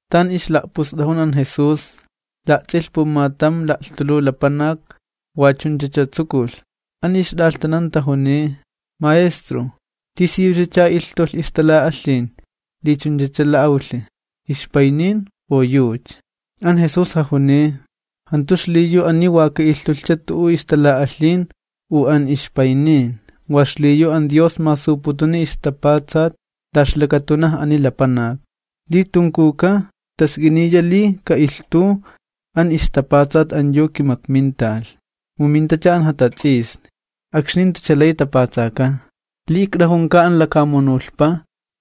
Tan ixla'pust'ajun an Jesús, la'ts'ilh pumatam la'lhtuluw lapanak, wa chunchacha tsukulh. An ixt'alhtanan tajuniy: ―Maestro, ¿tisiyuchacha ilhtulh ixtala'alhin li chunchacha la'awlhi, ixpaynin u yucha? An Jesús jajuniy: ―Jantu xliyu ani wa ka'ilhtulhcha tu'u ixtala'alhin u an ixpaynin, wa xliyu an Dios masuputuni ixtapatsat la ixlakatunaj ani lapanak. Li tunkuwka, task'iniya li ka'ilhtuw an ixtapatsat an yu kimakminta, mu mintacha an jatats'isni, akxni jantucha lay tapatsakan. Li ikt'ajunka an lakamunulhpa,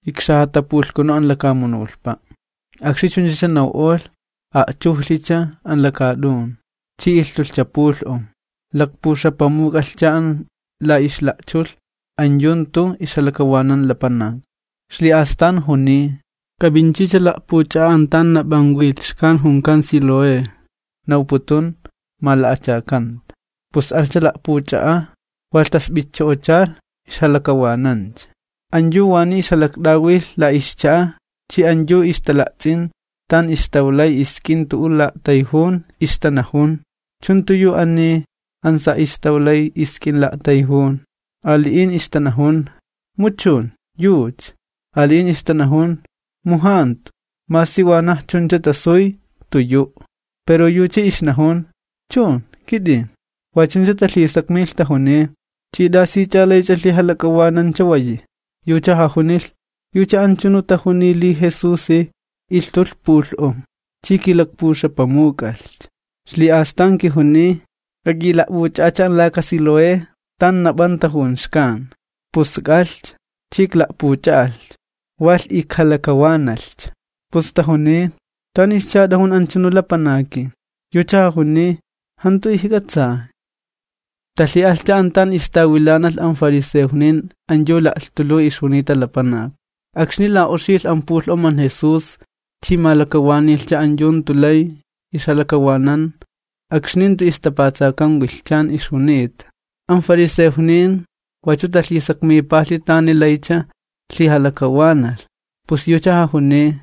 ikxajatapulhkunu an lakamunulhpa'. Akxni chunchacha naw'olh, a'chujlhicha an lakaat'un, chi ilhtulhcha pulh'om. Lakpuxapamuk'alhcha an la ixla'chulh an yu jantu ixjalakawanan lapanak. Ixli'astan juniy: ―K'ap'inchicha la'puch'a'a an tan nap'an wilh xkan junkan Siloé ―nawputun Mala'achakanta. Pus alhcha la'puch'a'a', walh tasp'itcho'ochalh, ixjalakawanancha. An yu waniy ixjalakt'awilh la ixcha'a chi an yu ixtala'ts'in tan ixtawlay isk'in tu'u la'a'tayjun, ixtanajun: ―¿Ani chu jantu yu an sa' ixtawlay isk'in la'a'tayjun? Ali'in ixtanajun: ―Mu chun, yucha. Ali'in ixtanajun: ―Mu jantu, masi wanaj chuncha tasuy jantu yu'. Pero yucha ixnajun: ―Chun, kit'in. Wa chuncha talhisakmilh tajuniy: ―¿Ch'i t'asich'a laych'a lhijalak'awanan chawayi? Yucha jajunilh: ―Yucha anchunu tajuniy li Jesusi ilhtulh pulh'om, chi kilakpuxapamuk'alhcha, ixli'astan kijuniy: “K'ak'ila'p'uch'a'acha an laka Siloé, tan nap'an tajun xkan.” Pus ik'alhcha, chi ikla'puch'a'alhcha, walh ijkalakawanalhcha. Pus tajuniy: ―¿Tanischa t'ajun anchunu lapanaki? Yucha jajuniy: ―Jantu ijk'atsay. Talhi'alhcha an tan ixtawilanalh an fariseojnin an yu la'lhtuluw ixjunita lapanak. Akxni la'oxilh an pulh'om an Jesús chi malakawanilhcha an yu jantu lay ixjalakawanan akxni jantu ixtapatsakan wilhchani ixjunita. An fariseojnin wachu talhisakmipalhi tani laycha lhijalakawanalh. Pus yucha jajuniy: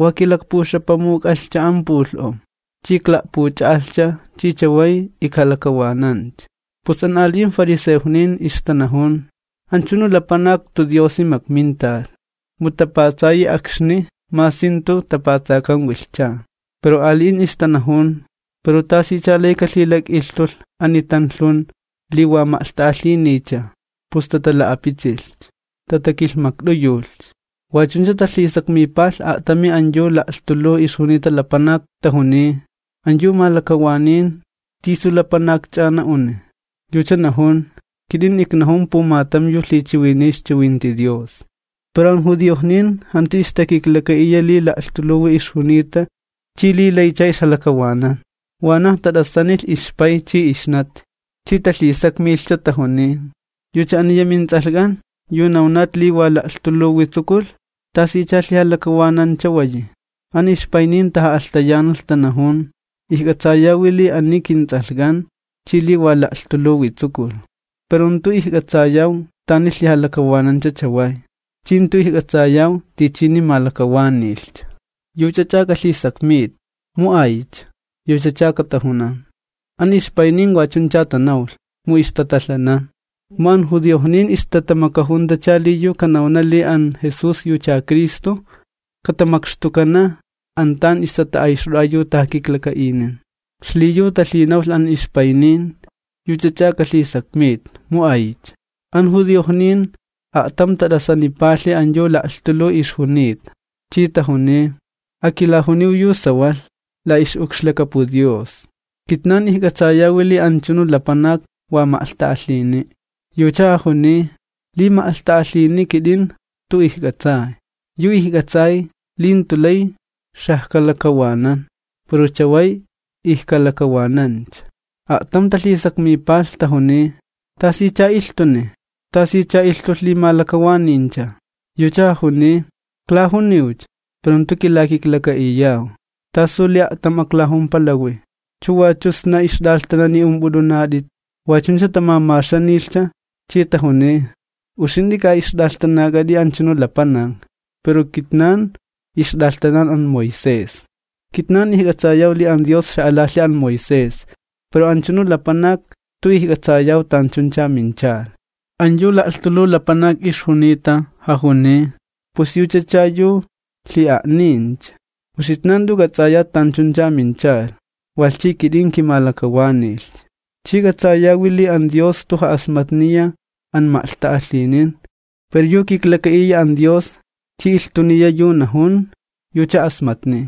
―Wa kilakpuxapamuk'alhcha an pulh'om, chi ikla'puch'a'alhcha chi chaway ijkalakawanancha. Pus an ali'in fariseojnin ixtanajun: ―Anchunu lapanak jantu Diosi makminta, mu tapatsayi akxni masi jantu tapatsakan wilhchan. Pero ali'in ixtanajun: ―¿Pero tasicha lay kalhilak'ilhtulh ani tanlhun li wa ma'lhta'alhiniycha? Pus tatala'apitsilhcha, tatakilhmakt'uyulhcha. Wa chuncha talhisakmipalh a'tami an yu la'lhtuluw ixjunita lapanak, tajuniy: ―An yu malakawanin, ¿tisu lapanakch'a na'uni? Yucha najun: ―Kit'in iknajun pumatam yu lhichiwiniy ixchiwinti Dios. Pero an judiojnin jantu ixtakiklaka'iya li la'lhtuluwi ixjunita chi li laycha ixjalakawanan, wanaj tat'asanilh ixpay chi ixnati chi talhisakmilhcha, tajuniy: ―¿Yucha aniya mints'alhk'an, yu nawnat li wa la'lhtuluwi tsukulh? ¿Tasicha lhijalakawanan chawayi? An ixpaynin taja'alhtayanalh tanajun: ―Ijk'atsayawi li ani yucha kints'alhk'an, chi li wa la'lhtuluwi tsukulh. Pero jantu ijk'atsayaw tani lhijalakawanancha chaway, chi jantu ijk'atsayaw tichini malakawanilhcha. Yuch'ach'a k'alhisakmit, mu aycha, yuchacha katajunan. An ixpaynin wa chuncha tanawlh, mu ixtatalhanan, mu an judiojnin ixtatamakajuntacha li yu kanawna li an Jesús yucha Cristo, katamakxtukana an tan ixtata'ayxt'o'a yu tajakiklaka'inin. Xliyu talhinawlh an ixpaynin: “Yuch'ach'a k'alhisakmit, mu aycha.” An judiojnin a'tam tat'asanipalhi an yu la'lhtuluw ixjunita, chi tajuniy: ―Akilajuniw yu sawalh la ix'ukxlakapu Dios. Kitnan ijk'atsayawi li anchunu lapanak wa ma'lhta'alhini'. Yucha jajuniy: ―Li ma'lhta'alhini, kit'in jantu ijk'atsay. Yu ijk'atsay, li jantu lay xajkalakawanan, pero chaway ijkalakawanancha. A'tam talhisakmipalh tajuniy: ―¿Tasicha ilhtuni? ¿Tasicha ilhtulh li malakawaniyncha? Yucha jajuniy: ―Iklajuniwcha, pero jantu kilakiklaka'iyaw. ¿Tasu li a'tam aklajumpalawi? ¿Chu wachu sna ixt'alhtanani ump'ut'unat'it? Wa chuncha tamamaxanilhcha, chi tajuniy: ―Uxint'i ka ixt'alhtanak'at'i anchunu lapanak, pero kitnan ixt'alhtanan an Moisés. Kitnan ijk'atsayaw li an Dios xa'alalhi an Moisés, pero anchunu lapanak jantu ijk'atsayaw tanchuncha minchalh. An yu la'lhtuluw lapanak ixjunita jajuniy: ―¡Pus yuchacha yu lhi'a'nincha! Uxitnan jant'u k'ats'ayat tanchuncha minchalh, walh chi kit'in kimalakawanilhcha. Chi k'atsayawi li an Dios jantu ja'asmatniya an ma'lhta'alhinin, pero yu kiklaka'iya an Dios chi ilhtuniya yu najun, yucha asmatniy.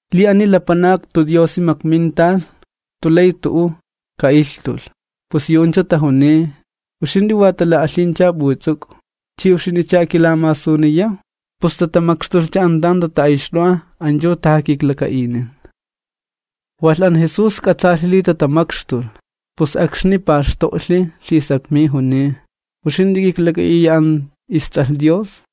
Li ani lapanak jantu Diosi makminta, jantu lay tu'u ka'ilhtulh. Pus yu'uncha tajuniy: ―Uxint'i wa tala'alhinch'a p'uts'uk'u, ¿chi uxint'icha akilamasuniyaw? Pus tatamakxtulhcha an tan ixtata'ayxt'o'a an yu tajakiklaka'inin. Walh an Jesús k'atsaalhi li tatamakxtulh, pus akxni paxto'lhi lhisakmiy juniy: ―¿Uxint'i k'iklak'a'iya an isTs'alh Dios?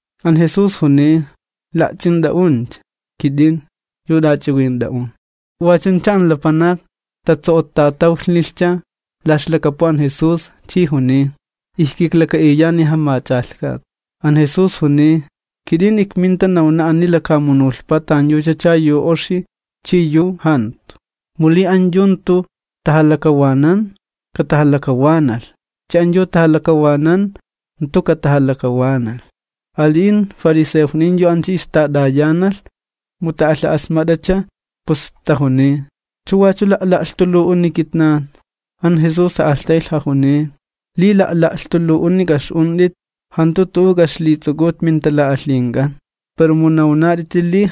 An Jesús juniy: ―La'ts'int'a'uncha, kit'in, yu t'ach'iwint'a'un. Wa chuncha an lapanak tatso'ottatawlhnilhcha la ixlakapu an Jesús, chi juniy: ―Ijkiklaka'iyani, Jamach'alhkat. An Jesús juniy: ―Kit'in ikminta nawna ani lakamunulhpa tanyuchacha yu oxi chi yu jantu, para li an yu jantu tajalakawanan, katajalakawanalh, chi an yu tajalakawanan jantu katajalakawanalh. Ali'in fariseojnin yu ancha ixtat'ayanalh, mu ta'alha'asmat'acha, pus tajuniy: ―¿Chu wachu la'la'lhtuluw'uni kitnan? An Jesús ja'alhtaylh jajuniy: ―Li la'la'lhtuluw'uni k'a'ix'unt'it, jantu tu'u k'a'ixlits'uk'ut mintala'alhink'an, pero mu nawnat'iti li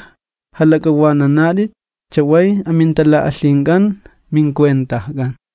jalak'awananat'it chaway amintala'alhink'an mincuentajk'an.